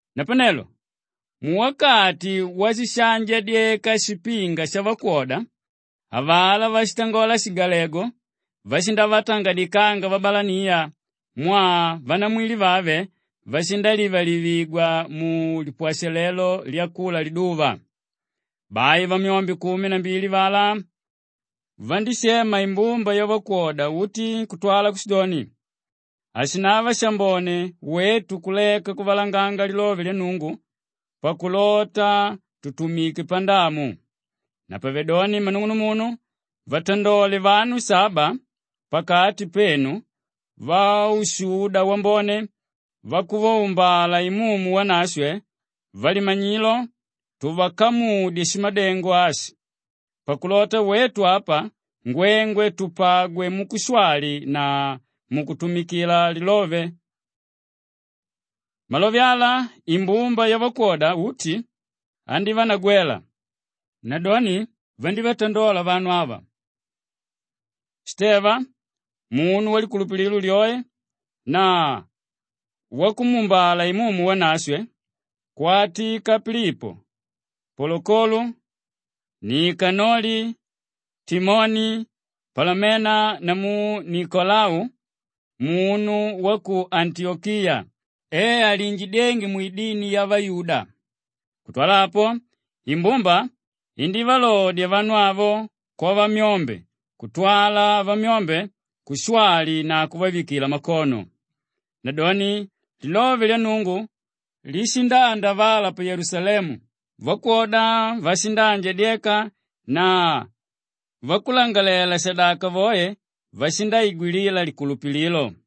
Napanelo muwakati washishaanjadyeka shipinga shavakwoda, avalá váshitangola shigalegu vashindavatangadikanga vabalaniya mwaa vanamwili vave vashindalivalivigwa mulipwashalelo lyakula liduva. Bai vamyombe kumi na mbili avalá vandíshema imbumba yavakwoda uti kutwala kushidoni, “Hashinava shambone wetu kuleka kuvalanganga lilove lya Nnungu pakulota tutumike pandamu.” Napavedoni mmanung'unumunu vatandole vanu saba pakati penu vaushuda wambone, vakuvaumbala Imumu Wanashwe, valimanyilo tuvakamudye shimadengo ashi pakulota wetu apa ngwengwe tupagwe mukushwali na mukutumikila lilove. Malove ala imbumba yavakwoda uti andívanagwela. Nadoni vandívatandola vanu ava: Shiteva munu walikulupililo lyoe na wakumuumbala Imumu Wanashwe, kwatika Pilipo, Polokolo, Nikanoli, Timoni, Palamena namu Nikolau munu wa ku Antiyokiya e aliinjidyénge mwidini yavayuda. Kutwala apo, imbumba indívalodya vanu avo kwavamyombe kutwala vamyombe kushwali na kuvavikila makono. Nadoni lilove lya Nnungu lishindaandavala; pa Yelusalemu vakwoda vashindaanjandyeka na vakulangalalela-shadaka voe vashindaigwilila likulupililo.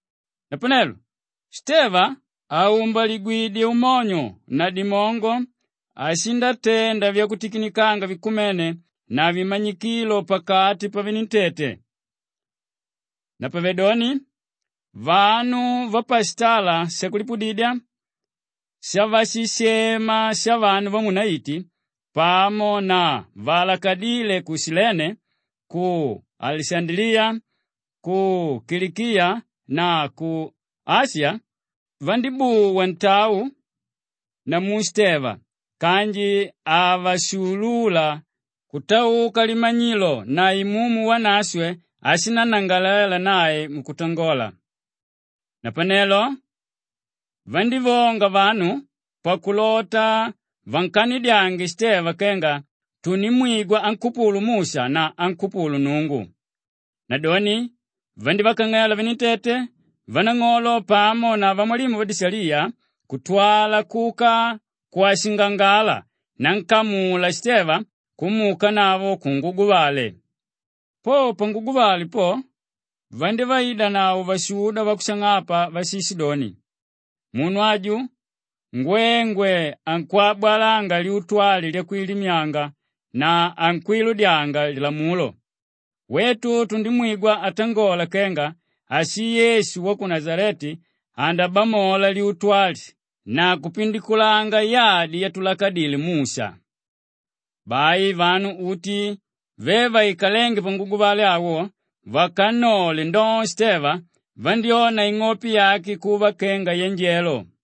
Napanelo Shiteva àumbaligwidye umonyo na dimongo ashindatenda vyakutikinikanga vikumene na vimanyikilo pakati pavenentete. Napavedoni vanu vapashitala shakulipudidya shavashishema “Shavanu vamuunaiti” pamo na vaalakadíle ku Shilene, ku Alishandaliya, ku Kilikiya na ku Ashiya vandíbuwa ntau namu Shiteva kanji havashuulula kutauka limanyilo na Imumu Wanashwe áshinnangalalela nae mukutangola. Napanelo vandívonga vanu pakulota vankanidyange Shiteva kenga vandimwigwa ankupulu Musha na ankupulu Nnungu. Nadoni vandívakang'ela venentete, vanang'olo pamo na vamwalimu vadishaliya kutwala kuka kwashingangala nankamula Shiteva kumuukanavo kunguguvale. Po panguguvale po, vandívaidanavo vashuda vakushang'apa váshishidoni, “Munu aju ngwengwe ankwabwalanga lyutu ali lyakwilimyanga na ankwiludyanga Lilamulo. Wetu tundimwigwa atangola kenga ashii Yesu wa ku Nashaleti andabamola lyutu ali na kupindikulanga yadi yatulakadile Musha.” Bai vanu uti ve vaikalénge panguguvale awo, vakannole ndoo Shiteva, vandyóna ing'ope yake kuva kenga yanjelo.